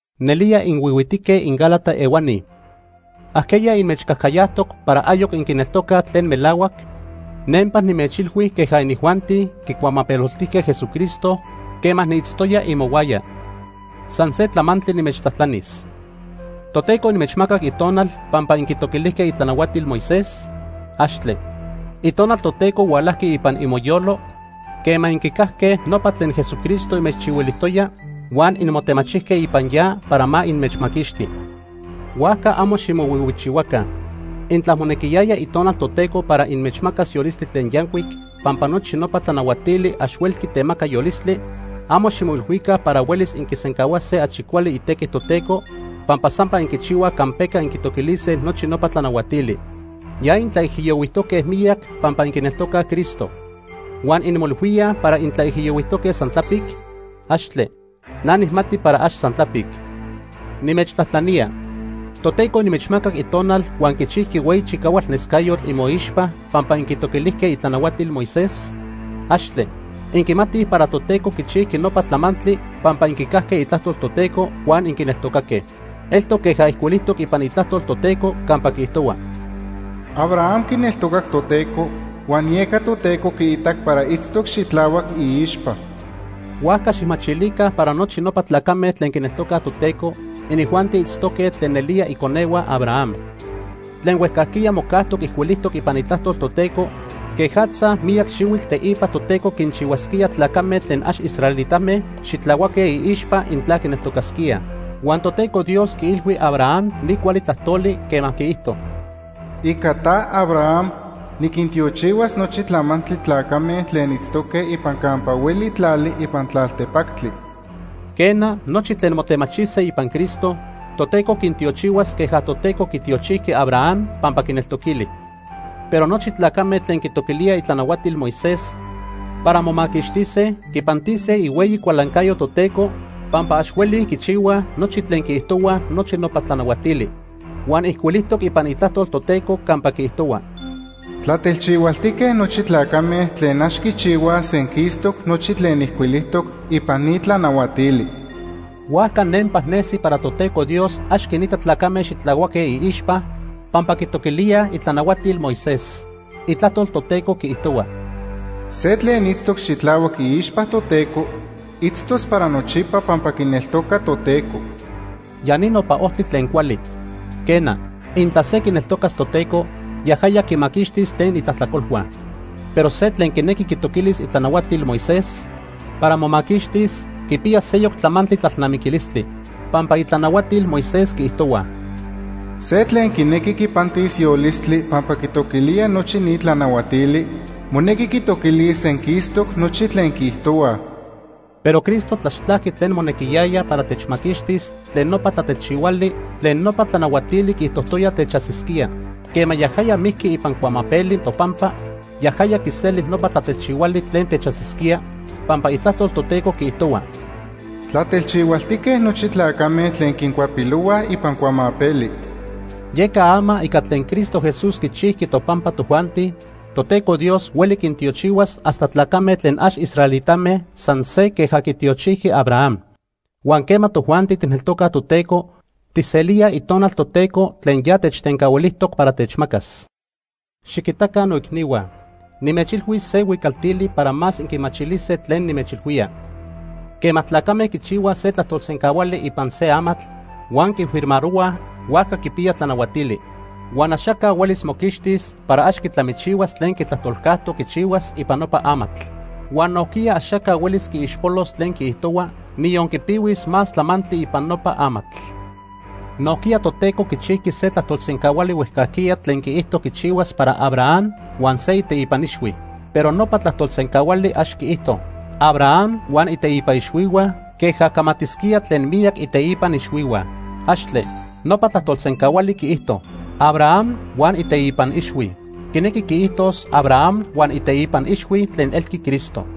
¡Nelía inhuihuitique inGálata ehuani! ¿Ajqueya inmechcajcayajtoc para ayoc inquineltocaj tlen melahuac? Nempa nimechilhui queja inijuanti quicuamapeloltijque Jesucristo quema niitztoya imohuaya. San se tlamantli nimechtlajtlanis. ¿Toteco inmechmacac Itonal pampa inquitoquilijque itlanahuatil Moisés? ¡Axtle! Itonal Toteco hualajqui ipan imoyolo quema inquicajque nopa tlen Jesucristo inmechchihuilijtoya, huan inmotemachijque ipan ya para ma inmechmaquixti. Huajca amo ximohuihuichihuaca. Intla monequiyaya Itonal Toteco para inmechmacas yolistli tlen yancuic pampa nochi nopa tlanahuatili ax huelqui temaca yolistli, amo ximoilhuica para huelis inquisencahuase achi cuali itequi Toteco pampa sampa inquichihuaj campeca inquitoquilise nochi nopa tlanahuatili. Ya intlaijiyohuijtoque miyac pampa inquineltocaj Cristo. ¿Huan inmoilhuíaj para intlaijiyohuijtoque san tlapic? ¡Axtle! Na nijmati para ax san tlapic. Nimechtlajtlanía: ¿Toteco inmechmacac Itonal huan quichijqui hueyi chicahualnescayotl imoixpa pampa inquintoquilijque itlanahuatil Moisés? ¡Axtle! Inquimatij para Toteco quichijqui nopa tlamantli pampa inquicajque Itlajtol Toteco huan inquineltocaque. Eltoc queja ijcuilijtoc ipan Itlajtol Toteco campa quiijtohua: “Abraham quineltocac Toteco, huan yeca Toteco quiitac para itztoc xitlahuac iixpa.” Huajca xijmachilica para nochi nopa tlacame tlen quineltocaj Toteco, inijuanti itztoque tlen nelía iconehua Abraham. Tlen huejcajquiya mocajtoc ijcuilijtoc ipan Itlajtol Toteco quejatza miyac xihuitl teipa Toteco quinchihuasquía tlacame tlen ax israelitame xitlahuaque iixpa intla quineltocasquíaj. Huan Toteco Dios quiilhui Abraham ni cuali tlajtoli quema quiijto: “Ica ta, Abraham, niquintiochihuas nochi tlamantli tlacame tlen itztoque ipan campa hueli tlali ipan tlaltepactli.” Quena, nochi tlen motemachise ipan Cristo, Toteco quintiochihuas queja Toteco quitiochijqui Abraham pampa quineltoquili. Pero nochi tlacame tlen quitoquilíaj itlanahuatil Moisés para momaquixtise, quipantise ihueyi cualancayo Toteco pampa ax huelij quichihuaj nochi tlen quiijtohuaj nochi nopa tlanahuatili. Huan ijcuilijtoc ipan Itlajtol Toteco campa quiijtohua: “Tlatelchihualtique nochi tlacame tlen ax quichihuaj senquistoc nochi tlen ijcuilijtoc ipan ni tlanahuatili.” Huajca nempa nesi para Toteco Dios ax quinita tlacame xitlahuaque iixpa pampa quitoquilíaj itlanahuatil Moisés. Itlajtol Toteco quiijtohua: “Se tlen itztoc xitlahuac iixpa Toteco, itztos para nochipa pampa quineltoca Toteco.” Ya ni nopa ojtli tlen cuali. Quena, intla se quineltocas Toteco, yajaya quimaquixtis tlen itlajtlacolhua. Pero se tlen quinequi quitoquilis itlanahuatil Moisés para momaquixtis quipiya seyoc tlamantli tlalnamiquilistli. Pampa itlanahuatil Moisés quiijtohuaj: “Se tlen quinequi quipantis yolistli pampa quitoquilía nochi ni tlanahuatili, monequi quitoquilis senquistoc nochi tlen quiijtohuaj.” Pero Cristo tlaxtlajqui tlen monequiyaya para techmaquixtis tlen nopa tlatelchihuali tlen nopa tlanahuatili quiijtojtoya techajsisquía. Quema yajaya mijqui ipan cuamapeli topampa, yajaya quiseli nopa tlatelchihuali tlen techajsisquía, pampa Itlajtol Toteco quiijtohua: “Tlatelchihualtique nochi tlacame tlen quincuapilohuaj ipan cuamapeli.” Yeca ama ica tlen Cristo Jesús quichijqui topampa tojuanti, Toteco Dios hueli quintiochihuas hasta tlacame tlen ax israelitame san se queja quitiochijqui Abraham. Huan quema tojuanti tijneltocaj Toteco, tijselíaj Itonal Toteco tlen ya techtencahuilijtoc para techmacas. Xiquitaca noicnihua. Nimechilhuis se huicaltili para más inquimachilise tlen nimechilhuía. Quema tlacame quichihuaj se tlajtolsencahuali ipan se amatl huan quifirmarohuaj, huajca quipiya tlanahuatili. Huan axaca huelis moquixtis para ax quitlamichihuas tlen quitlajtolcajtoc quichihuas ipan nopa amatl. Huan nojquiya axaca huelis quiixpolos tlen quiijtohua, niyon quipihuis más tlamantli ipan nopa amatl. Nojquiya Toteco quichijqui se tlajtolsencahuali huejcajquiya tlen quiijto quichihuas para Abraham huan se iteipan ixhui. Pero nopa tlajtolsencahuali ax quiijto: “Abraham huan iteipan ixhuihua”, queja camatisquía tlen miyac iteipan ixhuihua. ¡Axtle! Nopa tlajtolsencahuali quiijto: “Abraham huan iteipan ixhui.” Quinequi quiijtos Abraham huan iteipan ixhui tlen elqui Cristo.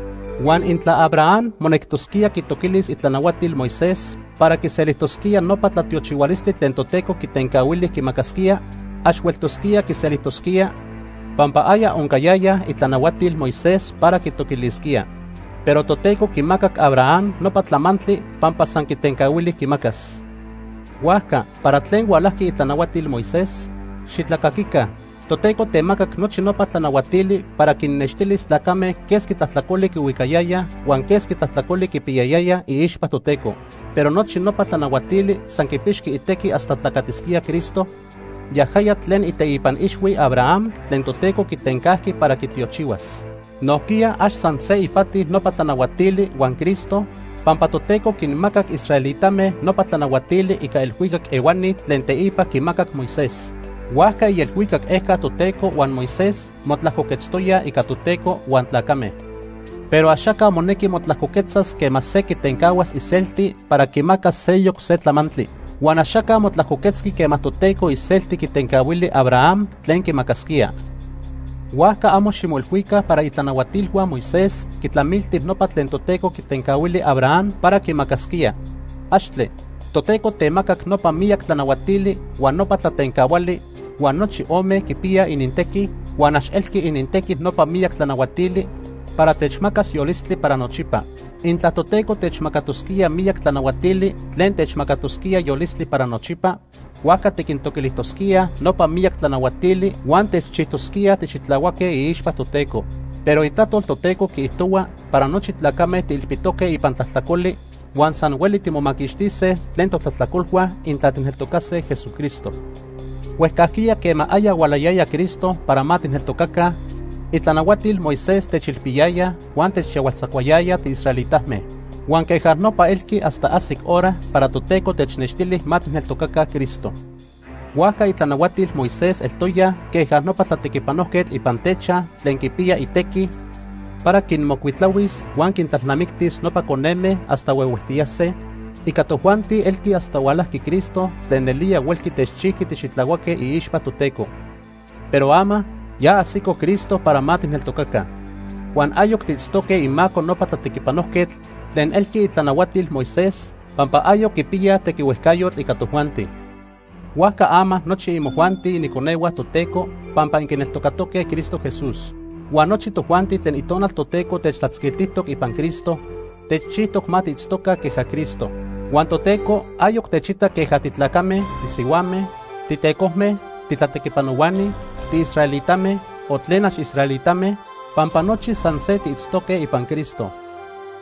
Huan intla Abraham monectosquía quitoquilis itlanahuatil Moisés para quiselijtosquía nopa tlatiochihualistli tlen Toteco quitencahuili quimacasquía, ax hueltosquía quiselijtosquía, pampa aya oncayayaj itlanahuatil Moisés para quitoquilisquía. Pero Toteco quimacac Abraham nopa tlamantli pampa san quitencahuili quimacas. Huajca, ¿para tlen hualajqui itlanahuatil Moisés? ¡Xitlacaquica! Toteco temacac nochi nopa tlanahuatili para quinnextilis tlacame quesqui tlajtlacoli quihuicayayaj huan quesqui tlajtlacoli quipiyayayaj iixpa Toteco. Pero nochi nopa tlanahuatili san quipixqui itequi hasta tlacatisquía Cristo, yajaya tlen iteipan ixhui Abraham tlen Toteco quitencajqui para quitiochihuas. Nojquiya ax san se ipati nopa tlanahuatili huan Cristo, pampa Toteco quinmacac israelitame nopa tlanahuatili ica elhuicac ehuani tlen teipa quimacac Moisés. Huajca ielhuicac ejca Toteco huan Moisés motlajcoquetztoyaj ica Toteco huan tlacame. Pero axaca monequi motlajcoquetzas quema se quitencahuas iselti para quimacas seyoc se tlamantli. Huan axaca motlajcoquetzqui quema Toteco iselti quitencahuili Abraham tlen quimacasquía. Huajca amo ximoilhuica para itlanahuatilhua Moisés quitlamilti nopa tlen Toteco quitencahuili Abraham para quimacasquía. ¡Axtle! Toteco temacac nopa miyac tlanahuatili huan nopa tlatencahuali huan nochi ome quipiyaj inintequi, huan ax elqui inintequi nopa miyac tlanahuatili para techmacas yolistli para nochipa. Intla Toteco techmacatosquía miyac tlanahuatili tlen techmacatosquía yolistli para nochipa, huajca tiquintoquilijtosquíaj nopa miyac tlanahuatili huan techchijtosquíaj tixitlahuaque iixpa Toteco. Pero Itlajtol Toteco quiijtohua para nochi titlacame tiilpitoque ipan tlajtlacoli, huan san hueli timomaquixtise tlen totlajtlacolhua intla tijneltocase Jesucristo. Huejcajquiya quema aya hualayaya Cristo para ma tijneltocaca, itlanahuatil Moisés techilpiyayaj huan techyahualtzacuayaya tiisraelitame. Huan queja nopa elqui hasta ajsic hora para Toteco technextili ma tijneltocaca Cristo. Huajca itlanahuatil Moisés eltoyaj queja nopa tlatequipanojquetl ipan techaj tlen quipiya itequi para quinmocuitlahuis huan quintlalnamictis nopa coneme hasta huehuejtiyase, ica tojuanti elqui hasta hualajqui Cristo tlen nelía huelqui techchijqui tixitlahuaque iixpa Toteco. Pero ama, ya ajsico Cristo para ma tijneltocaca, huan ayoc tiitztoque imaco nopa tlatequipanojquetl tlen elqui itlanahuatil Moisés, pampa ayoc quipiyaj tequihuejcayotl ica tojuanti. Huajca ama nochi imojuanti iniconehua Toteco pampa inquineltocatoque Cristo Jesús. Huan nochi tojuanti tlen Itonal Toteco techtlatzquiltijtoc ipan Cristo, techchijtoc ma tiitztoca queja Cristo. Huan Toteco ayoc techita queja titlacame, tisihuame, titecojme, titlatequipanohuani, tiisraelitame, o tlen ax tiisraelitame, pampa nochi san se tiitztoque ipan Cristo.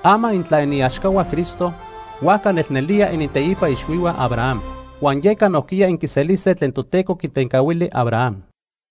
Ama intla iniaxcahua Cristo, huajca nelnelía initeipa ixhuihua Abraham. Huan yeca nojquiya inquiselise tlen Toteco quitencahuili Abraham.